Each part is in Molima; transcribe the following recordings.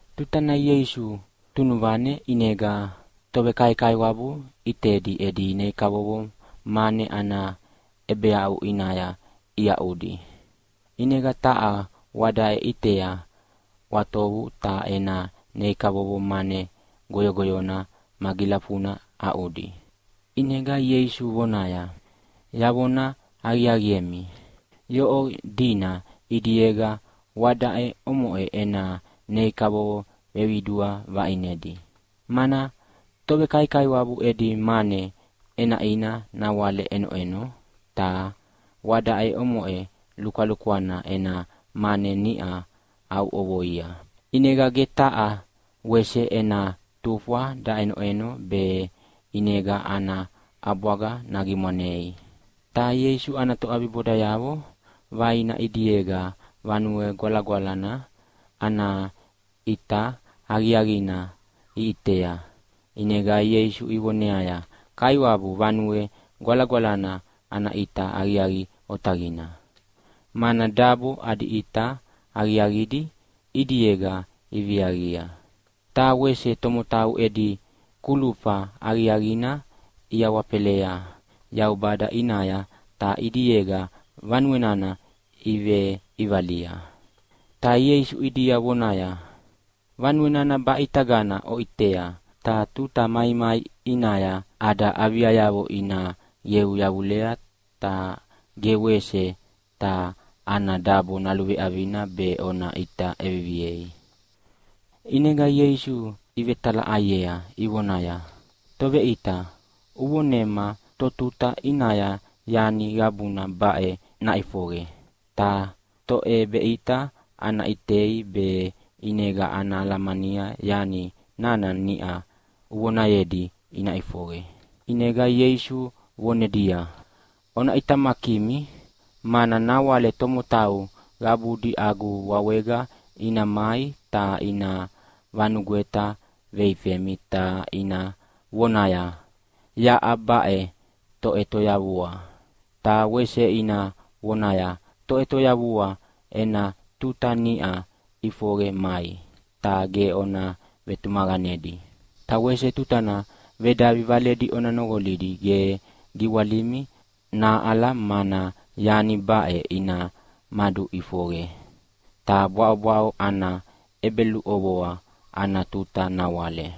Tutana Ieisu tunuvane ʼinega tovekaikaiwabu ʼitedi edi nei kavovo mane ana ʼebeaʼu ʼinaya iaʼuaʼudi. ʼInega taha wadaʼe ʼitea ʼwatovu ta ena nei kavovo mane goyogoyona magilafuna aʼuya. ʼInega Ieisu vonaya, “Yavona aqiaqiemi, yoʼo dina ʼidiega wadaʼe omoʼe ena nei kavovo veqidua vaʼinedi, mana tovekaikaiwabu edi mane ʼenaʼina nawale ʼenoʼeno, ta wadaʼe omoʼe lukwalukwana ena mane niʼa aʼuʼovoia, ʼinega ge taha wese ena tufwa daʼenoʼeno be ʼinega ana ʼabwaga nagimwanei.” Ta Ieisu ana toʼabibodayavo vaina ʼidiega Vanue Gwalagwalana ana ʼita aqiaqina iʼitea ʼinega Ieisu ivoneaya, “Kaiwabu, Vanue Gwalagwalana ana ʼita aqiaqi otaqina, mana dabo adi ʼita aqiaqidi ʼidiega iviaqia. Ta wese tomotau edi kulufa aqiaqina iawafelea Yaubada ʼinaya ta ʼidiega vanue nana iveʼivalia.” Ta Ieisu ʼidia vonaya, “Vanue nana baʼitagana oʼiteʼitea, ta tuta maimai ʼinaya ada aviayavo ina qeu yavulea ta ge wese taha ana dabo naluveʼavina be ona ʼita ʼeviviei.” ʼInega Ieisu ivetalaʼaiea ivonaya, “Toveʼita, uvonema totuta ʼinaya yani qabuna baʼe naʼifoqe, ta toʼebeʼita ana ʼitei be ʼinega ana alamania yani nana niʼa uvonayedi ina ʼifoqe?” ʼInega Ieisu vonedia, “Ona ʼitamakimi, mana nawale tomotau qabudi agu wawega ina mai ta ina vanugweta veifemi ta ina vonaya, ‘Yaʼa baʼe toʼetoyavua!’ ta wese ina vonaya, ‘Toʼetoyavua ena tuta niʼa ʼifoqe mai!’ Ta ge ona vetumaqanedi. Ta wese tutana vedavi valedi ona noqolidi ge giwalimi nahaʼala mana yani baʼe ina maduʼifoqe, ta bwaʼobwaʼo ana ʼebeluʼovoa ana tuta nawale.”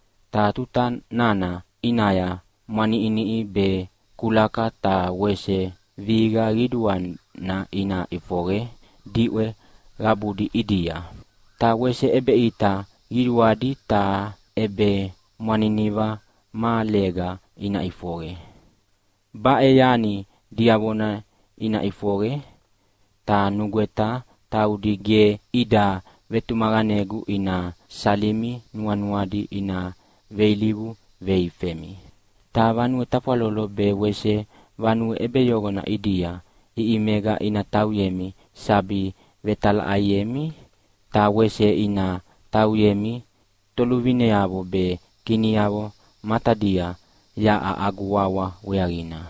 Ta tuta nana ʼinaya mwaniʼiniʼi be kulaka ta wese vihiqa qiduana ina ʼifoqe diʼwe qabudi ʼidia. Ta wese ʼebeʼita qiduadi ta ʼebemwaniniva mahalega ina ʼifoqe. Baʼe yani diavona ina ʼifoqe, ta nugweta taudi ge ida vetumaqanegu ina salimi nuanuadi ina veilivu veifemi. Ta vanue tafwalolo be wese vanue ʼebeyoqona ʼidia ʼiʼimega ina tauyemi sabi vetalaʼaiemi. Ta wese ina tauyemi toluvineavo be kiniavo matadia yaʼa agu wawa weaqina.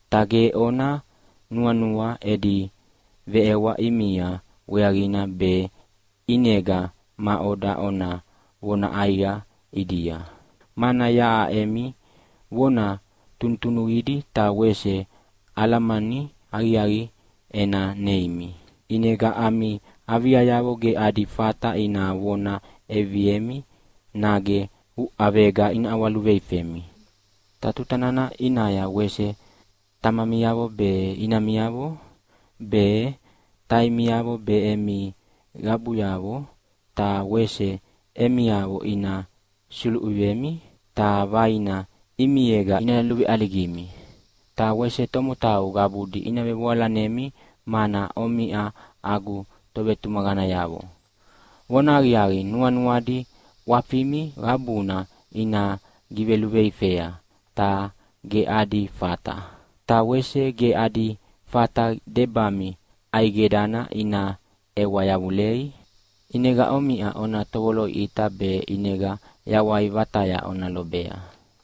Ta ge ona nuanua edi veʼewa ʼimia weaqina be ʼinega maʼoda ona vona ʼaiqa ʼidia, mana yaʼa emi vona tunutunuqidi ta wese alamani aqiaqi ena neimi. ʼInega ami aviayavo ge adi fata ina vona ʼeviviemi nage uʼavega ina ʼawaluveifemi. Ta tuta nana ʼinaya wese tamamiavo be, inamiavo be, taimiavo be, emi qabuyavo ta wese emiavo ina suluvemi, ta vaina ʼimiega ina luveʼaligimi. Ta wese tomotau qabudi ina vevoalanemi mana omiʼa agu tovetumaqanayavo. Vonahaqiaqi, nuanuadi ʼwafimi qabuna ina giveluveifea, ta ge adi fata. Ta wese ge adi fata debami ʼaidegana ina ʼewa yavulei. ʼInega omiʼa ona tovoloʼiʼita be ʼinega yawai vataya ona lobea.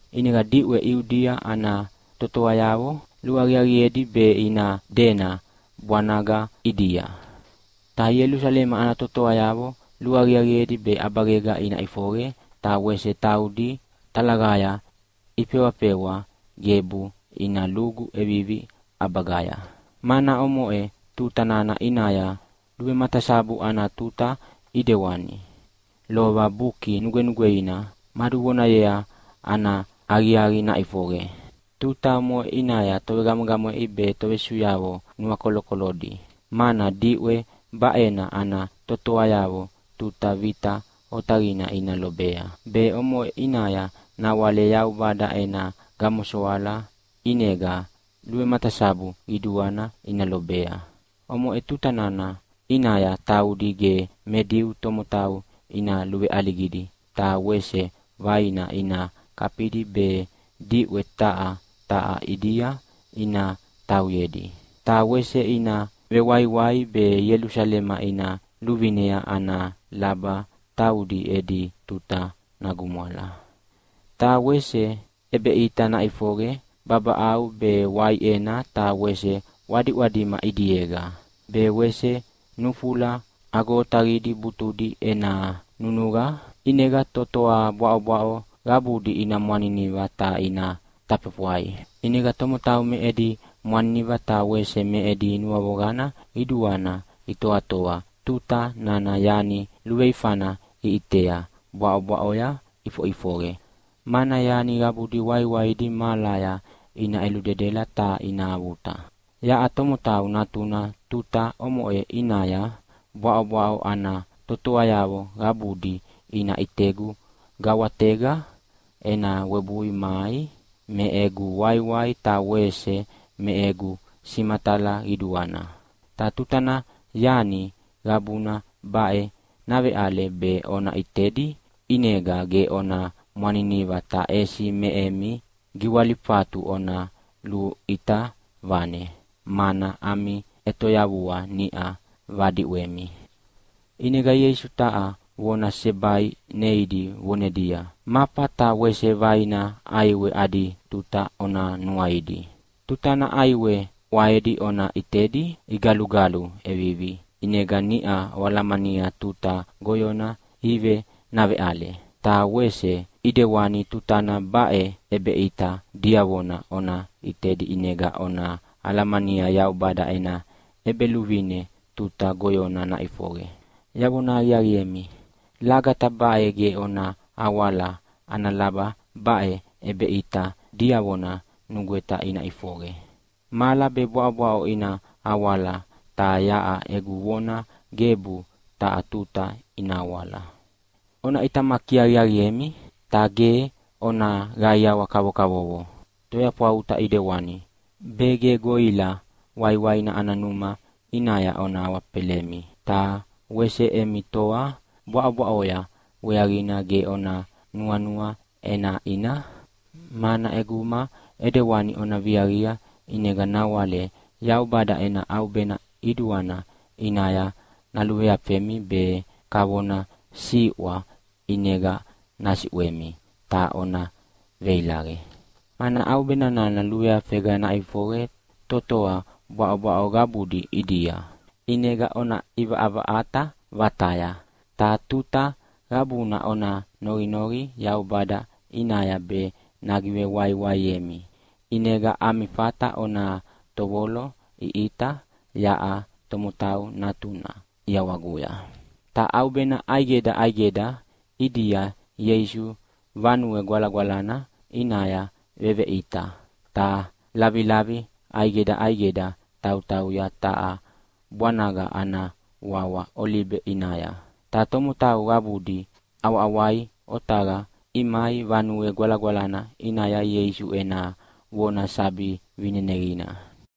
ʼInega diʼwe Iudia ana totoayavo luaqiaqiedi be ina dena bwanaga ʼidia. Ta Ielusalema ana totoayavo luaqiaqiedi be ʼabagega ina ʼifoqe, ta wese taudi talaqaya ifewafewa gebu ina lugu ʼevivi ʼabagaya. Mana omoʼe tuta nana ʼinaya luvematasabu ana tuta, ʼidewani lova Buki Nugwenugweina maduvonayea ana aqiaqi naʼifoqe. Tuta omoʼe ʼinaya tovegamwegamweʼi be tovesusuyavo nuakolokolodi, mana diʼwe baʼena ana totoayavo tuta vita otaqina ina lobea, be omoʼe ʼinaya nawale Yaubada ena gamosoala ʼinega luvematasabu qiduana ina lobea. Omoʼe tutana ʼinaya taudi ge me Diu tomotau ina luveʼaligidi ta wese vaina ina kafidi be diʼwe taha taha ʼidia ina tauyedi. Ta wese ina vewaiwai be Ielusalema ina luvinea ana laba taudi edi tuta nagumwala. “Ta wese ʼebeʼita naʼifoqe babaʼau be waiʼena ta wese ʼwadiʼwadima ʼidiega. Be wese nufula agoagodi butudi ena nunuqa ʼinega totoa bwaʼobwaʼo qabudi ina mwaniniva ta ina tafefwai. ʼInega tomotau me edi mwaniniva ta wese me edi nuavoqana qiduana itoatoa tuta nana yani luveifana iʼitea bwaʼobwaʼoya ʼifoʼifoqe, mana yani qabudi waiwaidi mahalaya ina ʼeludedela ta ina avuta. Yaʼa Tomotau Natuna tuta omoʼe ʼinaya bwaʼobwaʼo ana totoayavo qabudi ina ʼitegu gawatega ena webui mai me egu waiwai ta wese me egu simatala qiduana. Ta tutana yani qabuna baʼe naveʼale be ona ʼitedi, ʼinega ge ona mwaniniva ta ʼesi me emi giwalifatu ona luʼita vane, mana ami ʼetoyavua niʼa vadiʼwemi.” ʼInega Ieisu taha vona sesebai neidi vonedia, “Mafa ta wese vaina ʼaiwe adi tuta ona nuaidi. Tutana ʼaiwe ʼwaedi ona ʼitedi igalugalu ʼevivi ʼinega niʼa oalamania tuta goyona ive naveʼale. Ta wese ʼidewani tutana baʼe ʼebeʼita diavona ona ʼitedi ʼinega ona alamania Yaubada ena ʼEbeluvine tuta goyona naʼifoqe. “Yavona aqiaqiemi, lagata baʼe ge ona awala ana laba baʼe ʼebeʼita diavona nugweta ina ʼifoqe. Mahala be bwaʼobwaʼo ina awala ta yaʼa egu vonayavo gebu taha tuta ina awala. “Ona ʼitamaki aqiaqiemi, ta ge ona qaiawa kavokavovo toyafwauta ʼidewani, be ge goʼila waiwaina ana numa ʼinaya ona awafelemi. Ta wese emi toa bwaʼobwaʼoya weaqina ge ona nuanua ʼenaʼina. Mana ʼeguma ʼedewani ona viaqia ʼinega nawale Yaubada ena ʼaubena qiduana ʼinaya naluveafemi be kavona siʼwa ʼinega nasiʼwemi ta ona veilaqe. Mana ʼaubena nana luveafega naʼifoqe totoa bwaʼobwaʼo qabudi ʼidia. ʼInega ona ʼivaʼavaʼata vataya! Ta tuta qabuna ona noqinoqi Yaubada ʼinaya be nagivewaiwaiemi, ʼinega ami fata ona tovoloʼiʼita yaʼa Tomotau Natuna ʼiawaguya.” Ta ʼaubena ʼaidega ʼaidega ʼidia Ieisu Vanue Gwalagwalana ʼinaya veveʼita, ta lavilavi ʼaidega ʼaidega tautauya taha bwanaga ana wawa Olibe ʼinaya. Ta tomotau qabudi ʼawaʼawai otaqaya imai Vanue Gwalagwalana ʼinaya Ieisu ena vona sabi vineneqina.